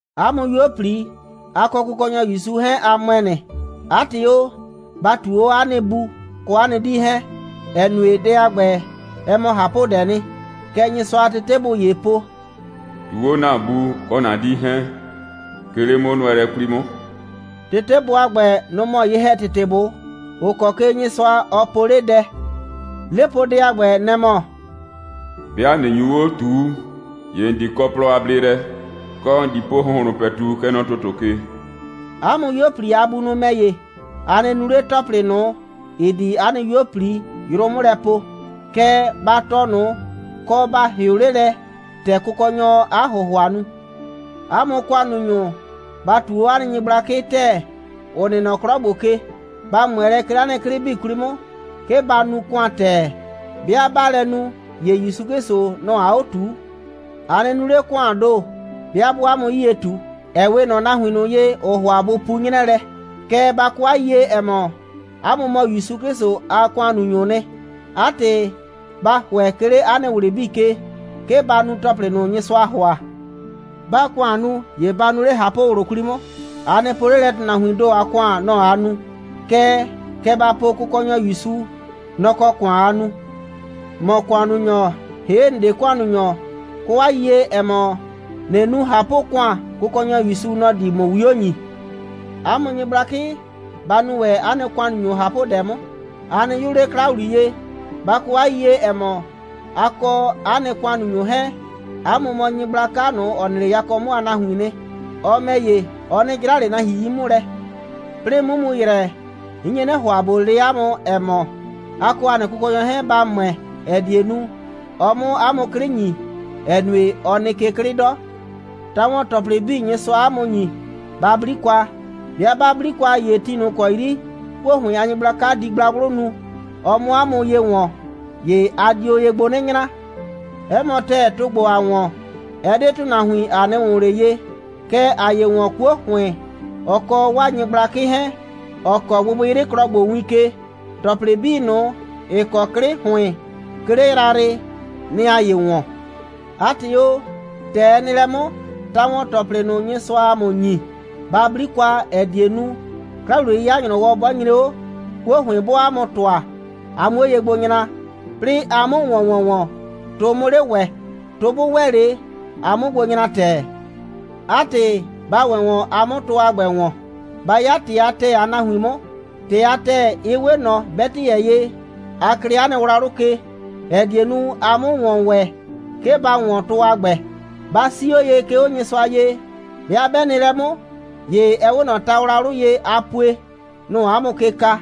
'A mʋ 'yuo꞊pli, a kɔ Kʋkɔnyɔ ‑Yusu 'hɛɛn, a ‑mʋɛ nɩ. 'A ‑tɩ o, ba ꞊tuu 'o 'a nɩ bu kɔ 'a nɩ 'dii 'hɛɛn, ‑ɛ nue, dɛ a ‑gbɛ, ɛ mɔ ꞊hapʋdɛɛ nɩ. Kɛ Nyɩsʋa a tetebʋ ‑yee po: «꞊Tuu 'o ‑na bu kɔ ‑na 'dii 'hɛɛn, 'ke 'le 'mʋnʋɛlɛ 'kwli 'mʋ.» Tetebʋ a ‑gbɛ, nʋ‑ mɔ ye‑hɛtetebʋ, ‑ʋ kɔ ke Nyɩsʋa, ɔ po 'le dɛ. 'Lepoodɛ a ‑gbɛ, nɛ‑ mɔ: «'Bɩa ꞊nɩ nyu 'o ꞊tuu, ‑ye ‑n di kɔ plɔ a bleelɛ, kɔ, ‑n di po ‑hʋnhlʋn ‑pɛtu, kɛ nɔ ‑tʋtʋ ke.» 'A mʋ 'yuo꞊pli a bunʋ ‑mɛ ‑ye, a nɩ nu 'le ‑tɔplɩ ꞊nʋ, ‑ɩ di 'a nɩ 'yuo꞊pli yrʋ 'mʋ lɛ poo. Kɛɛ, ba tɔɔ ꞊nʋ, kɔ, ba ‑hɩʋ 'le lɛ, ‑tɛ Kʋkɔnyɔɔ 'a ‑hʋhʋa nu. 'A mʋ ‑kʋannunyʋ, ba ꞊tuu 'o 'a nɩ nyɩgblakɩ ‑tɛɛ, ‑ʋ nɩ nɔ 'klɔ ‑gbo ke. Ba ꞊mʋɛ lɛ, 'ke 'le 'a nɩ 'klɩ 'bii 'kwli 'mʋ, 'ke ba nu ‑kʋan ‑tɛɛ. 'Bɩa 'baa lɛ nu, ‑ye ‑Yusu 'Klɩsʋ, nɔ‑ aa 'o ꞊tuu. A nɩ nu 'le ‑kʋaan ‑do, 'bɩa 'bʋʋ 'a mʋ 'yie ꞊tu, ‑ɛ 'we ꞊nɔ nahuin ꞊nʋ ye, ‑ʋʋ ‑hʋa bʋ pu 'nyrɛɛ lɛ. Kɛɛ, ba kɔ 'a yiyie, ‑ɛ mɔ, 'a mʋ mɔ ‑Yusu 'Klɩsʋ a ‑kʋannunyʋʋ nɩ. 'A ‑tɩ, ba ‑hʋɛ, 'ke 'le 'a nɩ ꞊wlɩ 'bii ke, 'ke ba nu ‑tɔplɩ ꞊nʋ, Nyɩsʋaa ‑hʋa. 'Baa ‑kʋan nu, ‑ye ba nuo 'le ꞊hapʋ꞊wlʋ 'kwli 'mʋ. A nɩ po 'le lɛ, ‑tʋnahuiin ‑do a ‑kʋan, nɔ‑ aa nu, kɛɛ, kɛ ba po, Kʋkɔnyɔ ‑Yusu, nɔ‑ kɔ ‑kʋan aa nu. ‑Mɔ ‑kʋannunyɔ, ‑hee' ‑n 'de ‑kʋannunyɔ, kɔ 'a yiyie, ‑ɛ mɔ, ꞊nɩ nu ꞊hapʋ‑kʋan, Kʋkɔnyɔ ‑Yusu, nɔ‑ di ‑mʋ 'wio ‑nyi. 'A mʋ nyɩgblakɩ, ba nu ‑wɛ 'a nɩ ‑kʋannunyʋ ꞊hapʋdɛ 'mʋ. A nɩ 'yʋʋ 'le 'kla ‑wliye. Ba kɔ 'a yiyie, ‑ɛ mɔ, a kɔ 'a nɩ ‑kʋannunyʋ 'hɛɛn, 'a mʋ mɔ Nyɩgblaka ꞊nʋ, ‑ɔ nɩ 'le yakɔ 'mʋ a nahuiin nɩ. Ɔ ‑mɛ ‑ye, ɔ 'nɩ 'jra ꞊le nahuin 'yi 'mʋ lɛ. 'Plɩɩ 'mʋ mu ‑yrɛ, 'n nye 'nɩ ‑hʋa ꞊bo le 'a mʋ, ‑ɛ mɔ: A kɔ ‑a nɩ Kʋkɔnyɔ 'hɛɛn, ba ‑mʋɛ, ‑ɛ die nu, ɔ 'mʋ 'a mʋ 'klɩ ‑nyi, ‑ɛ nue, ɔ nɩ ke 'klɩ 'dɔ. Ta‑wɔn‑tɔplɩ 'bii, Nyɩsʋaa 'a mʋ ‑nyi, ba 'bli kwa. 'Bɩa 'ba 'bli kwa, ‑ye ti ꞊nʋ ‑kɔ 'yri 'kuo ‑hʋɩn a nyɩgblaka di gblagblʋ nu, ɔ 'mʋ 'a mʋ ye ‑wɔn, ‑ye a dio ye gbo 'nɩ nyra. 'Ɛ mɔ ‑tɛɛ, tʋ ‑gbo, ‑aa ‑wɔn, ɛ 'de ‑tʋnahuin, ‑a 'nɩ ‑wʋn ꞊le ye, kɛɛ, ‑aa ye ‑wɔn 'kuo ‑hʋɩn, ɔ kɔ 'waa nyɩgblakɩ 'hɛɛn, ‑ɔ kɔɔ gbɩgbɩyrɩklɔ ‑gbo win ke. ‑Tɔplɩ 'bii ꞊nʋ, ‑ɩ kɔ 'klɩ ‑hʋɩn, 'ke 'le yrayrɩ, nɩ‑ ‑aa ye ‑wɔn. 'A ‑tɩ o, ‑tɛ ɛ nɩ lɛ 'mʋ, ta‑wɔn‑tɔplɩ ꞊nʋ, Nyɩsʋaa ‑a mʋ ‑nyi, ba 'bli kwa, ‑ɛ die nu, 'kla‑wliye'yɩya a ‑nyrɔwɔ 'bɔ nyre 'o, 'kuo ‑hʋɩn 'bɔɔ 'a mʋ ‑tʋa, a 'muo ye gbo nyra, 'plɩɩ a 'mʋ ‑wɔn ‑wɔnwɔn, tʋ 'mʋ 'le ‑wɛ, tʋ 'bʋ ‑wɛ 'le, a 'mʋ gbo nyra ‑tɛɛ. 'A ‑tɩ, ba ‑wɛ ‑wɔn, a 'mʋ tʋ a ‑gbɛ ‑wɔn. Ba 'ya ‑tɩ a ‑tɛɛ a nahuin 'mʋ. ‑Tɩ a ‑tɛɛ, ɩ 'we ꞊nɔ 'bɛtɩyɛ ye, a klɩɩ 'a nɩ wlawlʋ ke, ‑ɛ die nu, a 'mʋ ‑wɔn ‑wɛ, 'ke ba ‑wɔn tʋ a ‑gbɛ. Ba 'sii 'o ye, 'ke 'o Nyɩsʋa ye. 'Bɩa 'bɛ nɩ lɛ 'mʋ, ‑ye ɛ 'we ꞊nɔ tawlawlʋ ye, a pue. Nʋ‑ʋ 'a mʋ ke ka.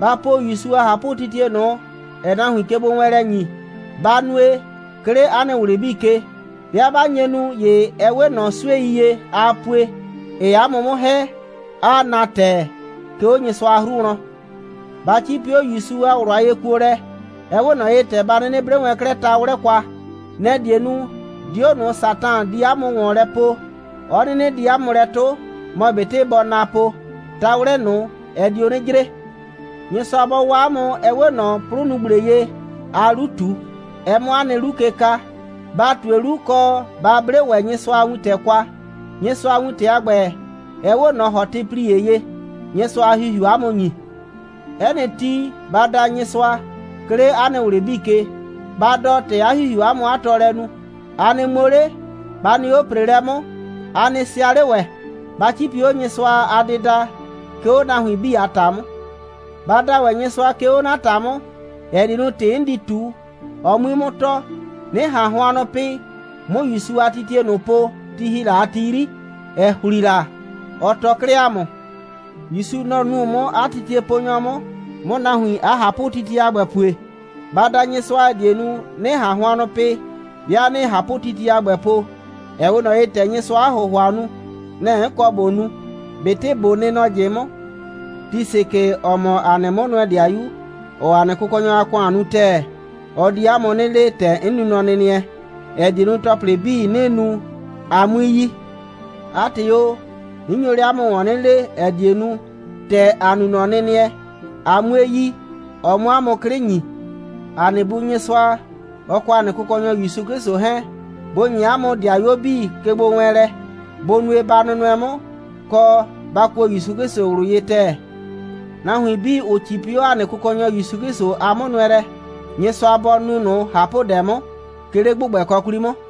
Ba po ‑Yusu a ꞊hapʋtitie ꞊nʋ, ‑ɛɛ nahuin kegbowɛɛnlɛ ‑nyi. Ba nue, 'ke 'le 'a nɩ ꞊wlɩ 'bii ke. 'Bɩa 'ba nye nu, ‑ye ɛ 'we ꞊nɔ 'suei ye, a pue, ‑ɩɩ 'a mʋ 'mʋ ‑hɛ, 'aa na ‑tɛɛ, 'ke 'o Nyɩsʋa a 'hru wlɔn. Ba 'cipi 'o ‑Yusu a ꞊wlʋ a yekuolɛ. Ɛ 'we ꞊nɔ ye, ‑tɛ ba 'nɩnɩ 'ble wɛn 'klɛɛ ta'wlɛ kwa. Nɛ‑ die nu, 'dio ꞊nʋ, Satan di 'a mʋ ‑wɔn lɛ poo, 'ɔ 'nɩnɩ di 'a mʋ lɛ 'tʋ. Mɔ ꞊betɩ bɔɔ na po, ta'wlɛ ꞊nʋ, ɛ dio 'nɩ jre. Nyɩsʋa bɔ waa 'a mʋ, ɛ 'we ꞊nɔ 'plʋnugble ye, aa 'lu ꞊tu, ɛ 'mʋ 'a nɩ 'lu ke ka. Ba ꞊tue 'lu, kɔ, ba 'ble ‑wɛ Nyɩsʋa a wintɛ kwa. Nyɩsʋa a wintɛ a ‑gbɛ, ɛ 'we ꞊nɔ ‑hɔtɩplie ye, Nyɩsʋa a ‑Hihiuu 'a mʋ ‑nyi. 'Ɛ nɩ ti, ba da Nyɩsʋa, 'ke 'le 'a nɩ ꞊wlɩ 'bii ke. Ba dɔ, ‑tɛ 'a ‑Hihiuu 'a mʋ 'a tɔɔlɛ nu. A nɩ ŋmo 'le, ba nɩ 'o ‑preelɛ 'mʋ, a nɩ sɩa 'le ‑wɛ. Ba 'cipi 'o Nyɩsʋa a dɩda, 'ke 'o 'a nahuin 'bii a ‑ta 'mʋ. Ba da ‑wɛ Nyɩsʋa, 'ke 'o 'na ‑ta 'mʋ, ‑ɛ die nu, ‑tɩ 'n di ꞊tu, ɔ 'mui 'mʋ tɔɔ, 'nɩ ꞊han hʋannʋ pɩ, 'mʋ ‑Yusu a ꞊hapʋtitie ꞊nʋ po, ti ‑hi la a ti 'yri, ‑ɛ ‑hli la, kɛɛ, ɔ tɔɔ 'klɛɛ ‑a mʋ. ‑Yusu, nɔ‑ nu 'mʋ 'a titieponyɔ 'mʋ, 'mʋ nahuin 'a ꞊hapʋtitie a ‑gbɛ pue. Ba da Nyɩsʋa, ‑ɛ die nu, 'nɩ ꞊han hʋannʋ pɩ, 'bɩa 'nɩɩ ꞊hapʋtitie a ‑gbɛ po, ‑ɛ 'we ꞊nɔ ye, ‑tɛ Nyɩsʋaa 'a ‑hʋhʋa nu. Nɛ‑ 'n kɔ ꞊bo nu, ꞊betɩ ꞊bo nɩ nɔ ꞊jɩ 'mʋ. Tisikɩ, ‑ɔ mɔ ‑a nɩ 'mʋnʋɛ‑dɩayu, ‑ɔɔ ‑a nɩ Kʋkɔnyɔ a ‑kʋan nu ‑tɛɛ, ɔ di 'a mʋ 'nɩ le, ‑tɛ 'n nu nɔnɩnɩɛ, ‑ɛ die nu, ‑tɔplɩ 'bii, 'nɩɩ nu, a 'mui yi. 'A ‑tɩ o, 'n nyo 'le 'a mʋ ‑wɔn 'nɩ lee, ‑ɛ die nu, ‑tɛ ‑a nu nɔnɩnɩɛ, a 'mue yi, ɔ 'mʋ 'a mʋ 'klɩ ‑nyi. ‑A nɩ Bu Nyɩsʋa, ɔ kɔ ‑a nɩ Kʋkɔnyɔ ‑Yusu 'Klɩsʋ 'hɛɛn, bʋ ‑nye 'a mʋ ‑dɩayuo 'bii kegbowɛɛnlɛ. Bʋ nue, ba nʋnʋɛ 'mʋ, kɔ, ba kuo ‑Yusu 'Klɩsʋ ꞊wlʋ ye ‑tɛɛ. Nahuin 'bii, ‑ʋ 'cipi 'o ‑a nɩ Kʋkɔnyɔ ‑Yusu 'Klɩsʋ a 'mʋnʋɛlɛ, Nyɩsʋa bɔ nu ꞊nʋ ꞊hapʋdɛ 'mʋ, 'ke 'le ‑gbʋgbɛkɔ 'kwli 'mʋ.